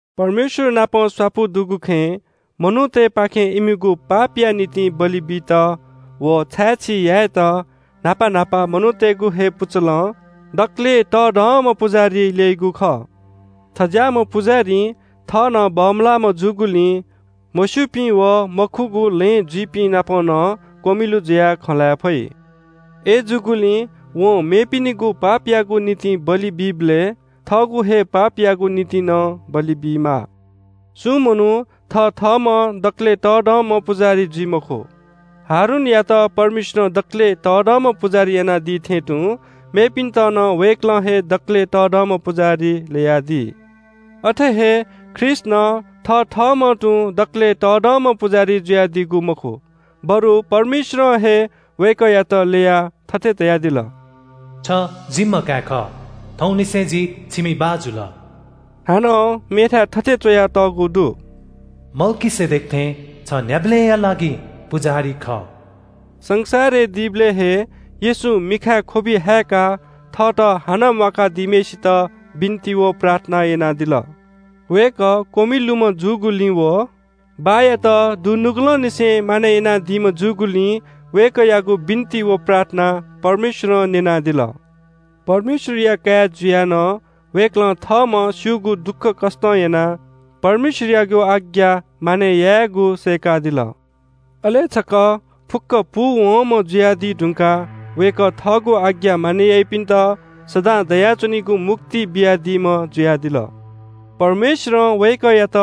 परमेश्‍वरनापं स्‍वापु दुगु खँय् मनूतय्‌पाखें इमिगु पापया निंतिं बलि बित व छाय्‌छी यायेत न्‍हापा न्‍हापा मनूतय्‌गु हे पुचलं दकलय् तःधंम्‍ह पुजाहारी ल्‍यइगु खः। थज्‍याःम्‍ह पुजाहारीं थः नं बमलाःम्‍ह जूगुलिं मस्‍यूपिं व मखुगु लँय् जुइपिंनाप नं क्‍वमिलु जुयाः खँ ल्‍हाये फइ। अय्‌जूगुलिं वं मेपिनिगु पापयागु निंतिं बलि बीबलय् थःगु हे पापयागु निंतिं नं बलि बीमाः। सुं मनू थथःम्‍हं दकलय् तःधंम्‍ह पुजाहारी जुइ मखु। हारूनयात परमेश्‍वरं दकलय् तःधंम्‍ह पुजाहारी यानादी थें तुं मेपिन्‍त नं वय्‌कलं हे दकलय् तःधंम्‍ह पुजाहारी ल्‍ययादी। अथे हे ख्रीष्‍ट नं थथःम्‍हं तुं दकलय् तःधंम्‍ह पुजाहारी जुयादीगु मखु, बरु परमेश्‍वरं हे वय्‌कःयात ल्‍ययाः थथे धयादिल – “छ जिम्‍ह काय् खः, थौंनिसें जि छिमि बाः जुल।” हानं मेथाय् थथे च्‍वयातःगु दु – “मल्‍कीसेदेक थें छ न्‍ह्याबलेंया लागिं पुजाहारी खः।” संसारय् दीबलय् हे येशूं मिखाय् ख्‍वबि हाय्‌काः थःत हानं म्‍वाका दीम्‍हय्‌सित बिन्‍ति व प्रार्थना यानादिल। वय्‌कः क्‍वमिलुम्‍ह जूगुलिं व बाःयात दुनुगलंनिसें मानय् यानादीम्‍ह जूगुलिं वय्‌कःयागु बिन्‍ति व प्रार्थना परमेश्‍वरं न्‍यनादिल। परमेश्‍वरया काय् जुयाः नं वय्‌कलं थःम्‍हं स्‍यूगु दुःखकष्‍टं यानाः परमेश्‍वरयागु आज्ञा मानय् यायेगु सय्‌कादिल। अले छकः फुक्‍क पूवंम्‍ह जुयादी धुंकाः वय्‌कः थःगु आज्ञा मानय् याइपिन्‍त सदां दयाच्‍वनीगु मुक्ति बियादीम्‍ह जुयादिल। परमेश्‍वरं वय्‌कःयात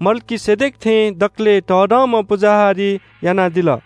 मल्‍कीसेदेक थें दकलय् तःधंम्‍ह पुजाहारी यानादिल।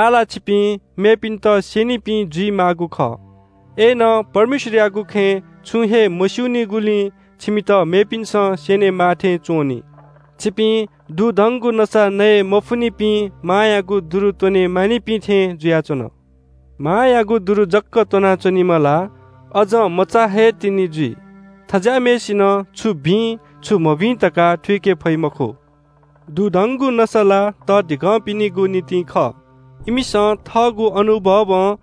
आः ला छिपिं मेपिन्‍त स्‍यनीपिं जुइमाःगु खः। अय्‌नं परमेश्‍वरयागु खँय् छुं हे मस्‍यूनिगुलिं छिमित मेपिन्‍सं स्‍यनेमाः थें च्‍वं नि। छिपिं दुधंगु नसा नये मफुनिपिं मांयागु दुरु त्‍वने मानिपिं थें जुयाच्‍वन। मांयागु दुरु जक त्‍वनाच्‍वनीम्‍ह ला अझं मचा हे तिनि जुइ। थज्‍याःम्‍हय्‌सिनं छु भिं, छु मभिं धकाः थुइके फइ मखु। दुधंगु नसा ला तःधिकःपिनिगु निंतिं खः। इमिसं थःगु अनुभवं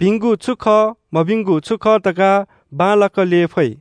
भिंगु छु खः, मभिंगु छु खः धकाः बांलाक ल्‍यये फइ।